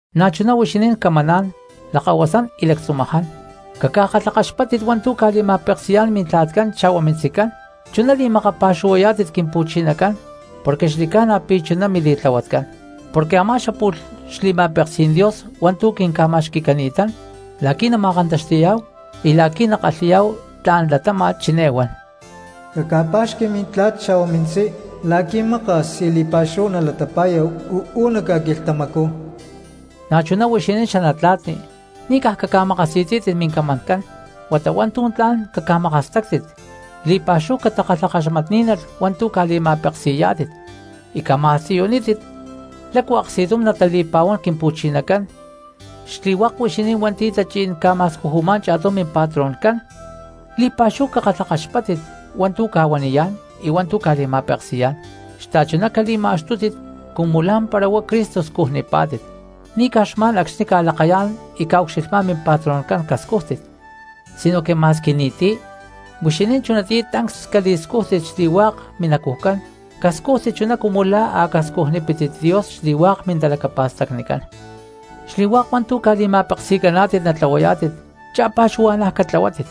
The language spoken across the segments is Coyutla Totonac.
Na̠chuná huixinín camaná̠n lakahuasán y lactzumaján, caca̠kalhakaxpáttit hua̠ntu̠ ca̠li̠ma̠peksi̠yá̠n mintla̠tcán xa̠hua mintzicán, chuná li̠makapa̠xuhuayá̠tit Quimpu̠chinacán porque xli̠ca̠na pi̠ chuná mili̠tlahuatcán. Porque a̠má xapu̠lh xli̠ma̠peksí̠n Dios hua̠ntu̠ quinca̠ma̠xqui̠cani̠ta̠n la̠qui̠ nama̠kantaxti̠yá̠hu y la̠qui̠ nakalhi̠yá̠hu tla̠n latáma̠t chiné huan: “Caca̠pa̠xqui mintla̠t xa̠hua mintzí, la̠qui̠ maka̠s y li̠pa̠xúhu nalatapa̠ya uú nac ca̠quilhtamacú.” Na̠chuná huixinín xanatla̠tni, ni̠ caj caca̠makasi̠tzí̠tit mincamancán, huata hua̠ntu̠ tla̠n caca̠makastáctit, li̠pa̠xúhu catakalhakaxmatní̠nalh hua̠ntu̠ ca̠li̠ma̠peksi̠yá̠tit y caca̠ma̠siyunítit lácu aksti̠tum natali̠pa̠huán Quimpu̠chinacán. Xli̠hua̠k huixinín hua̠nti̠ tachí̠n ca̠ma̠scujumá̠n cha̠tum mimpatroncán, li̠pa̠xúhu cakalhakaxpáttit hua̠ntu̠ ca̠huaniyá̠n y hua̠ntu̠ ca̠li̠ma̠peksi̠yá̠n xta̠chuná cali̠ma̠xtútit cumu lá̠mpara huá Cristo scujnipá̠tit. Ni̠ caj xma̠n acxni̠ ca̠lakayá̠n y ca̠ucxilhmá̠n mimpatroncán cascújtit sinoque ma̠squi ni̠ti̠, huixinín chunatiyá tancs cali̠scújtit xli̠hua̠k minacujcán cascújtit chuná cumu la̠ a̠ cascujnipítit Dios xli̠hua̠k mintalacapa̠stacnicán. Xli̠hua̠k hua̠ntu̠ ca̠li̠ma̠peksi̠caná̠tit natlahuayá̠tit cha̠pa̠xuhua̠na̠ catlahuátit,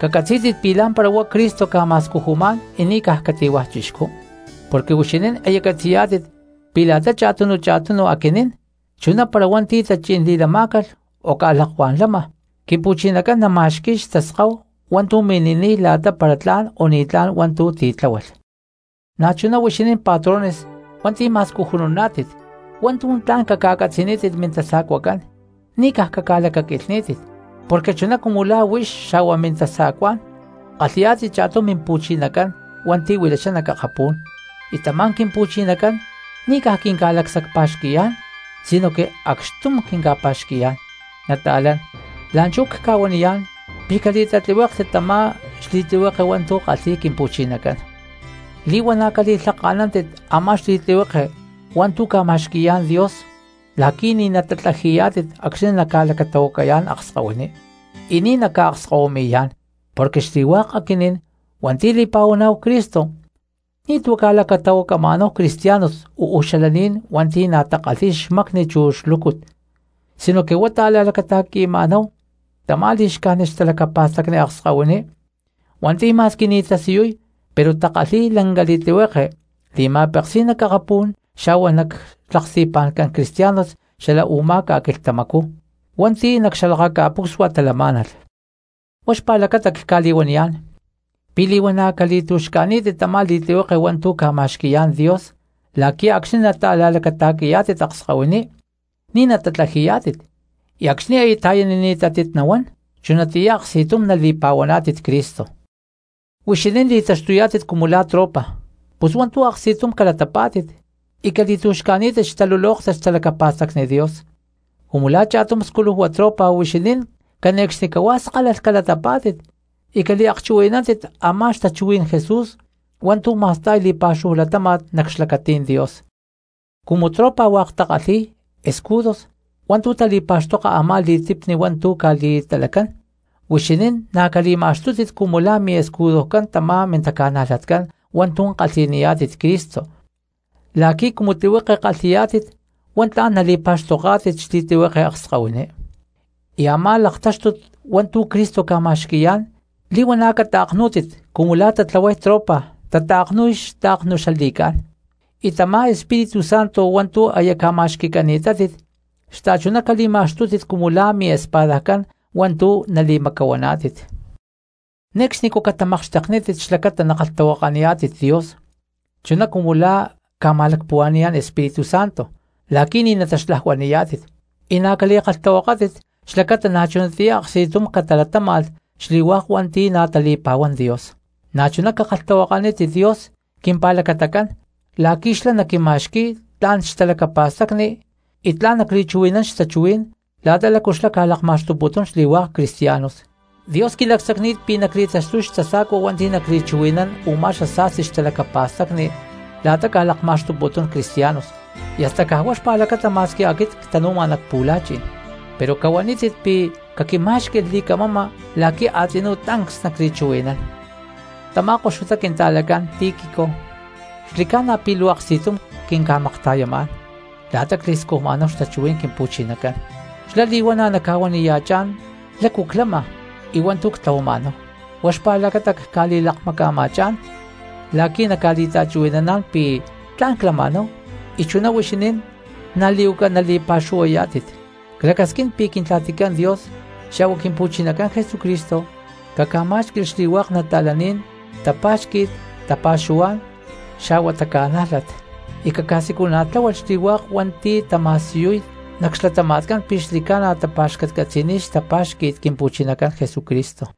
cacatzí̠tit pi̠ lá̠mpara huá Cristo ca̠ma̠scujumá̠n y ni̠ caj cati̠hua̠ chixcú. Porque huixinín aya catzi̠yá̠tit pi̠ la̠ta cha̠tunu cha̠tunu aquinín chuná para hua̠nti̠ tachí̠n li̠lamá̠calh o ca̠lakuá̠n lama, Quimpu̠chinacán nama̠xqui̠y xtaskáhu hua̠ntu̠ mini̠niy la̠ta para tla̠n o ni̠tlá̠n hua̠ntu̠ titláhualh. Na̠chuná huixinín patrones hua̠nti̠ ma̠scujununá̠tit, hua̠ntu̠ tla̠n caca̠catzi̠nítit mintasa̠cuacán ni̠ caj caca̠lacaquilhní̠tit. Porque chuná cumu la̠ huix xa̠hua mintasa̠cuá̠n kalhi̠yá̠tit cha̠tum Mimpu̠chinacán hua̠nti̠ huilachá nac akapú̠n, y tamá Quimpu̠chinacán ni̠ quinca̠lacsacpa̠xqui̠yá̠n sinoque acxtum quinca̠pa̠xqui̠yá̠n. Nata̠lán, la̠nchú cca̠huaniyá̠n pi̠ cali̠tatlihuéklhtit tamá xli̠tlihueke hua̠ntu̠ kalhi̠y Quimpu̠chinacán. Li̠huana̠ cali̠lhaka̠nántit a̠má xli̠tlihueke hua̠ntu̠ ca̠ma̠xqui̠yá̠n Dios la̠qui̠ ni̠ natatlaji̠yá̠tit acxni̠ naca̠lacatahuacayá̠n akskahuiní, y ni̠ naca̠akskahuimi̠yá̠n. Porque xli̠hua̠k aquinín hua̠nti̠ li̠pa̠huaná̠hu Cristo ni̠tu̠ ca̠lacatahuacama̠náhu cristianos uú xalaní̠n hua̠nti̠ na̠ takalhi̠y xmacni chu xlúcut, sinoque huá ta̠la̠lacata̠qui̠ma̠náhu tamá li̠xcájnit xtalacapa̠stacni akskahuiní hua̠nti̠ ma̠squi ni̠ tasiyuy pero takalhi̠y lanca li̠tlihueke li̠ma̠peksí̠n nac akapú̠n xa̠hua nac xlaksti̠pa̠ncán cristianos xala u̠má ca̠quilhtamacú hua̠nti̠ nac xalakaca̠pucsua talamá̠nalh. Huá xpa̠lacata cca̠li̠huaniyá̠n pi̠ li̠huana̠ cali̠tu̠xca̠ní̠tit tamá li̠tlihueke hua̠ntu̠ ca̠ma̠xqui̠yá̠n Dios la̠qui̠ acxni̠ nata̠la̠lacata̠qui̠yá̠tit akskahuiní ni̠ natatlaji̠yá̠tit y acxni̠ aya ta̠yanini̠tátit nahuán chunatiyá aksti̠tum nali̠pa̠huaná̠tit Cristo. Cumu huixinín li̠taxtuyá̠tit cumu la̠ tropa, pus hua̠ntu̠ aksti̠tum calatapá̠tit y cali̠tu̠xca̠ní̠tit xtalulóktat xtalacapa̠stacni Dios. Cumu la̠ cha̠tum sculujua tropa huixinín cane̠cxnicahuá skálalh calatapá̠tit y caliakchuhui̠nántit a̠má xtachuhuí̠n Jesús hua̠ntu̠ ma̠sta̠y li̠pa̠xúhu latáma̠t nac xlacatí̠n Dios. Cumu tropa hua̠k takalhi̠y escudos hua̠ntu̠ tali̠pa̠xtoka a̠má li̠tipni hua̠ntu̠ ca̠li̠talacán, huixinín na̠ cali̠ma̠xtútit cumu la̠ miescudocán tamá mintaca̠najlatcán hua̠ntu̠ kalhi̠niyá̠tit Cristo la̠qui̠ cumu tlihueke kalhi̠yá̠tit huá tla̠n nali̠pa̠xtoká̠tit xli̠tlihueke akskahuiní. Y a̠má laktáxtut hua̠ntu̠ Cristo ca̠ma̠xqui̠yá̠n li̠huana̠ cata̠knú̠tit cumu la̠ taway tropa tata̠knu̠y xta̠knu xla li̠cá̠n. Y tamá Espíritu Santo hua̠ntu̠ aya ca̠ma̠xqui̠cani̠tátit xta̠chuná cali̠ma̠xtútit cumu la̠ miespada hua̠ntu̠ nali̠macapa̠huana. Ne̠cxnicú catamakxteknítit xlacata nakalhtahuakaniyá̠tit Dios chuná cumu la̠ ca̠ma̠lacpuhua̠ni̠yá̠n Espíritu Santo la̠qui̠ ni̠ nataxlajuani̠yá̠tit. Y na̠ cali̠kalhtahuakátit xlacata na̠chunatiyá aksti̠tum catalatáma̠lh xli̠hua̠k hua̠nti̠ na̠ tali̠pa̠huán Dios. Na̠chuná cakalhtahuakanítit Dios quimpa̠lacatacán la̠qui̠ xlá naquima̠xqui̠y tla̠n xtalacapa̠stacni y tla̠n nacli̠chuhui̠nán xtachuhuí̠n la̠ta lácu xlá ca̠lakma̠xtuputún xli̠hua̠k cristianos. Dios quili̠lacsacni̠t pi̠ nacli̠taxtuy xtasa̠cua hua̠nti̠ nacli̠chuhui̠nán u̠má xasa̠sti xtalacapa̠stacni la̠ta ca̠lakma̠xtuputún cristianos y hasta caj huá xpa̠lacata ma̠squi aquit ctanu̠ma nac pu̠la̠chi̠n. Pero cahuanítit pi̠ caquimá̠xqui̠lh li̠camama la̠qui̠ a̠tzinú tancs nacli̠chuhui̠nán. Tamá koxutá quinta̠lacán Tíquico xli̠ca̠na pi̠ luu aksti̠tum quinca̠makta̠yamá̠n la̠ta cli̠scujma̠náhu xtachuhuí̠n Quimpu̠chinacán, xlá li̠huana̠ naca̠huaniya̠chá̠n lácu clama y hua̠ntu̠ ctlahuama̠náhu. Huá xpa̠lacata cca̠li̠lakmaca̠ma̠chá̠n la̠qui̠ naca̠li̠ta̠chuhui̠naná̠n pi̠ tla̠n clama̠náhu y chuná huixinín na̠ li̠huaca naliakpuhuantiyayá̠tit. Clacasquín pi̠ Quintla̠ticán Dios xa̠hua Quimpu̠chinacán Jesucristo caca̠má̠xqui̠lh xli̠hua̠k nata̠laní̠n tapa̠xqui̠t, tapa̠xuhuá̠n xa̠hua taca̠nájlat, y caca̠siculana̠tláhualh xli̠hua̠k hua̠nti̠ tama̠siyuy nac xlatama̠tcán pi̠ xli̠ca̠na tapa̠xcatcatzi̠niy xtapá̠xqui̠t Quimpu̠chinacán Jesucristo.